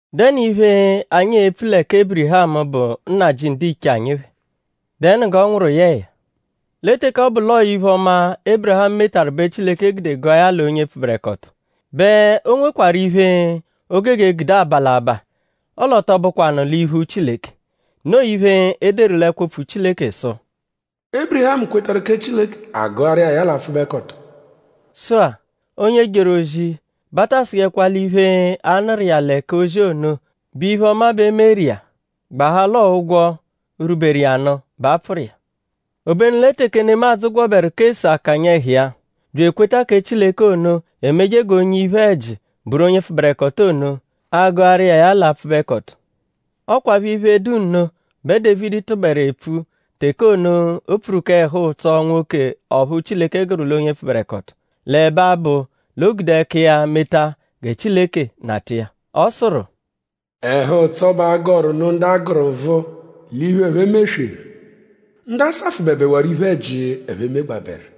?Dẹnu iphe, anyi e-pfu lẹ kẹ Ébirihamu, bụ nnajị ndiche anyi phẹ??Dẹnu g'ọ nwụru yẹ ya? Lẹ teke ọ bụ l'ọo iphe-ọma, Ébirihamu metaru bẹ Chileke gude gụa ya l'onye pfụberekoto; bẹ o nwekwarụ iphe, o gogo gude aba l'abaa; ọle ọ tọ bụkwanu l'iphu Chileke. Noo iphe, e deru l'ẹkwo-opfu Chileke sụ: “Ébirihamu kwetarụ kẹ Chileke; a gụaru iya ya l'apfụbekoto.” Sụ-a; onye jeru ozi bẹ a ta sụjekwa l'iphe, a nụru iya lẹ k'ozi ono bụ iphe-ọma bẹ e meru iya; gbahaa l'ọo ụgwo, rwuberu iya nụ bẹ a pfụru iya. Obenu lẹ teke nemadzụ gwọberu k'ese akanya ẹhu iya; bya ekweta kẹ Chileke ono emeje g'onye iphe-ẹji bụru onye pfụberekoto ono; a gụaru iya ya l'apfụbekoto. Ọ kwaphọ iphe, dụ nno bẹ Dévidi tụberu epfu teke ono, o pfuru k'ẹhu-ụtso nwoke ọphu Chileke gụru l'onye pfụberekoto; l'ẹbe abụ l'o gude ẹka iya meta gẹ Chileke nata iya. Ọ sụru: “Ẹhu-ụtso bẹ a gọru nụ ndu a gụru nvụ l'iphe, ẹphe mesweru; ndu a safụbebewaaru iphe-ẹji, ẹphe megbabẹru.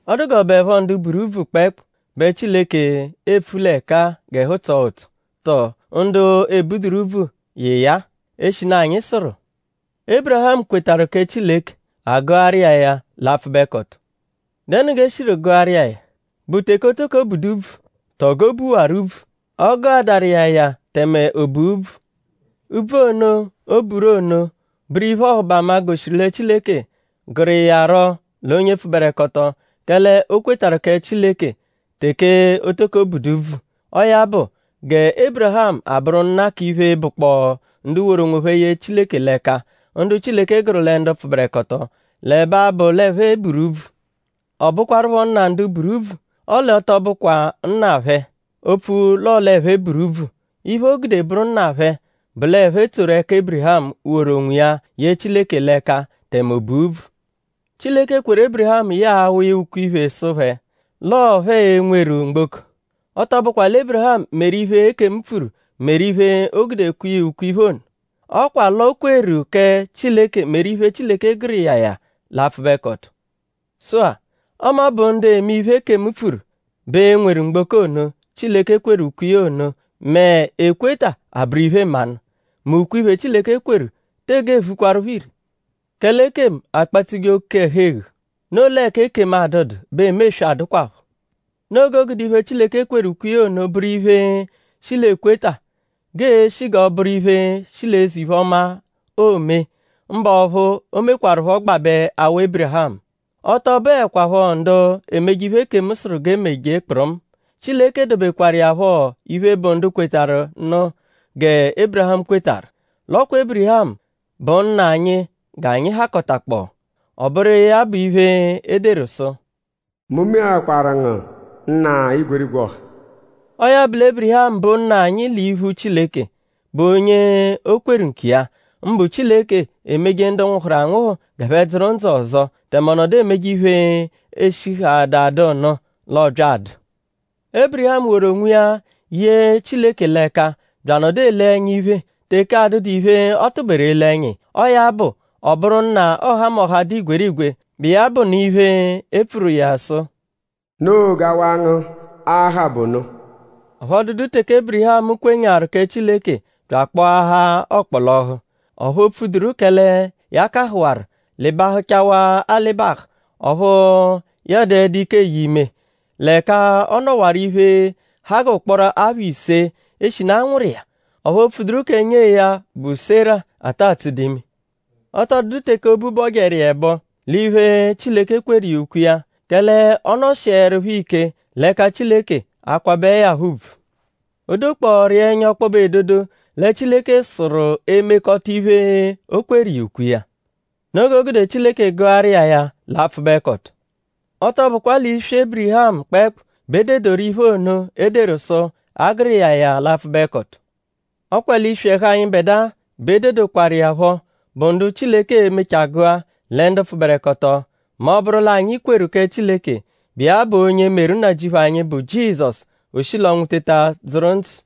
?Ọ dụ g'ọ bụepho ndu buru úbvù kpẹekpu bẹ Chileke epfu l'ẹka-a g'ẹhu tsọo ụtso? Tọo;?ndu ebuduru úbvù yị iya-a? Eshinu anyi sụru: “Ébirihamu kwetarụ kẹ Chileke; a gụaru iya ya l'apfụbekoto.” ?Dẹnu g'eshiru gụaru iya ya??Bụ teke o toko budu úbvù; tọo g'o buwaru úbvù? Ọ gụadaru iya ya tẹme o bua úbvù. Úbvù ono, o buru ono bụru iphe-ọhubama, goshiru lẹ Chileke gụru iya rọ l'onye pfụberekoto; kẹle o kwetarụ kẹ Chileke teke o toko budu úbvù. Ọo ya bụ gẹ Ébirihamu abụru nna k'iphe, bụkpoo ndu woru onwophẹ ye Chileke l'ẹka; ndu Chileke gụru lẹ ndu pfụberekoto l'ẹbe abụ l'ẹphe buru úbvù. Ọ bụkwarupho nna ndu buru úbvù; ọle ọ tọ bụkwa nna phẹ; opfu l'ọo l'ẹphe buru úbvù; iphe, o gude bụru nna phẹ bụ l'ẹphe tsoru ẹka Ébirihamu, woru onwiya ye Chileke l'ẹka tẹme o bua úbvù. Chileke kweru Ébirihamu yẹe awa iya ukwe-iphe sụ phẹ: l'ọo phẹ e-nweru mgboko. Ọ tọ bụkwa lẹ Ébirihamu meru iphe, ekemu pfuru meru iphe, o gude kwe iya ukwe-iphe ono. Ọ kwa l'o kweru kẹ Chileke meru iphe, Chileke gụru iya ya l'apfụbekoto. Sụ-a; ọme ọ bụ ndu eme iphe, ekemu pfuru bẹ e-nweru mgboko ono, Chileke kweru ukwe iya ono mẹ ekweta abụru iphe-mmanụ; mẹ ukwe-iphe, Chileke kweru tege vukwaruphọ ire. Kẹle ekemu akpatsuje oke-ẹhu-eghu. Noo l'ẹka ekemu adụdu bẹ emeswe adụkwapho. Noo g'o gude iphe, Chileke kweru ukwe iya ono bụru iphe, shi l'ekweta; g'ee-shi g'ọo-bụru iphe, shi l'eze-iphe-ọma, oome; mbụ ọphu o mekwarụpho gbabẹ awa Ébirihamu. Ọ tọ bụekwapho ndu emeje iphe, ekemu sụru g'e meje kpụrumu. Chileke dobekwaru iya phọ iphe, bụ ndu kwetarụ nụ gẹ Ébirihamu kwetarụ. L'ọ kwa Ébirihamu bụ nna anyi g'anyi hakọtakpoo. Ọ bụru iya bụ iphe, e deru sụ: “Mu meakwaru ngu nna igwerigwe ọha.” Ọo ya bụ lẹ Ébirihamu bụ nna anyi l'iphu Chileke, bụ onye o kweru nkiya; mbụ Chileke, emeje ndu nwụhuru anwụhu g'ẹphe dzụru ndzụ ọzo; tẹme ọ nọdu emeje iphe, eshihaada dụ nụ l'ọo-bya adụ. Ébirihamu woru onwiya ye Chileke l'ẹka; bya anọdu ele ẹnya iphe; teke adụdu iphe, ọ tụberu ele ẹnya iya. Ọo ya bụ; ọ bụru nna ọhamoha, dụ igwerigwe, bụ iya bụ nụ iphe, e pfuru iya sụ: “Noo g'awa ngu a-ha bụ ono.” Ọphu ọ dụdu teke Ébirihamu kwenyaarụ kẹ Chileke bya akpọahaa ọkpolohu. Ọphu o pfuduru kẹle ya kahụwaru; lịbahuchawaa alịbahu ọphu ya a-dụedu ike eye ime; l'ẹka ọ nọwaru iphe, ha g'ụkporo apha ise eshinu a nwụru iya; ọphu o pfuduru kẹ nyee ya, bụ Sera, ata tsụdu ime. Ọ tọ dụdu teke obu bọjeru iya ẹbo l'iphe, Chileke kweru iya ukwe iya; kẹle ọ nọshierupho ike l'ẹka Chileke akwabẹe ya phọ ùbvù. O dokpọoru iya ẹnya ọkpobe edodo lẹ Chileke sụru emekọta iphe, o kweru iya ukwe iya. Noo g'o gude Chileke gụaru iya ya l'apfụbekoto. Ọ tọ bụkwa l'iswi ẹhu Ébirihamu kpẹekpu bẹ e dedoru iphe ono, e deru sụ: A gụru iya ya l'apfụbekoto. Ọ kwa l'iswi ẹhu anyịbedua bẹ e dedokwaru iya phọ, bụ ndu Chileke e-mechaa gụa lẹ ndu pfụberekoto; mẹ ọ -bụru l'anyi kweru kẹ Chileke, bụ iya bụ onye meru Nnajịuphu anyi, bụ Jizọsu; o shi l'ọnwu teta dzụru ndzụ.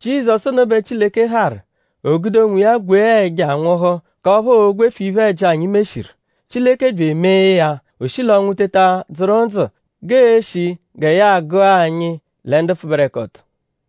Jizọsu ono bẹ Chileke harụ; o gude onwiya gwee ẹja nwụhu k'ọphu oo-gwefu iphe-ẹji, anyi meshiru. Chileke bya emee ya; o shi l'ọnwu teta dzụru ndzụ g'e-shi gẹ ya agụa anyi lẹ ndu pfụberekoto.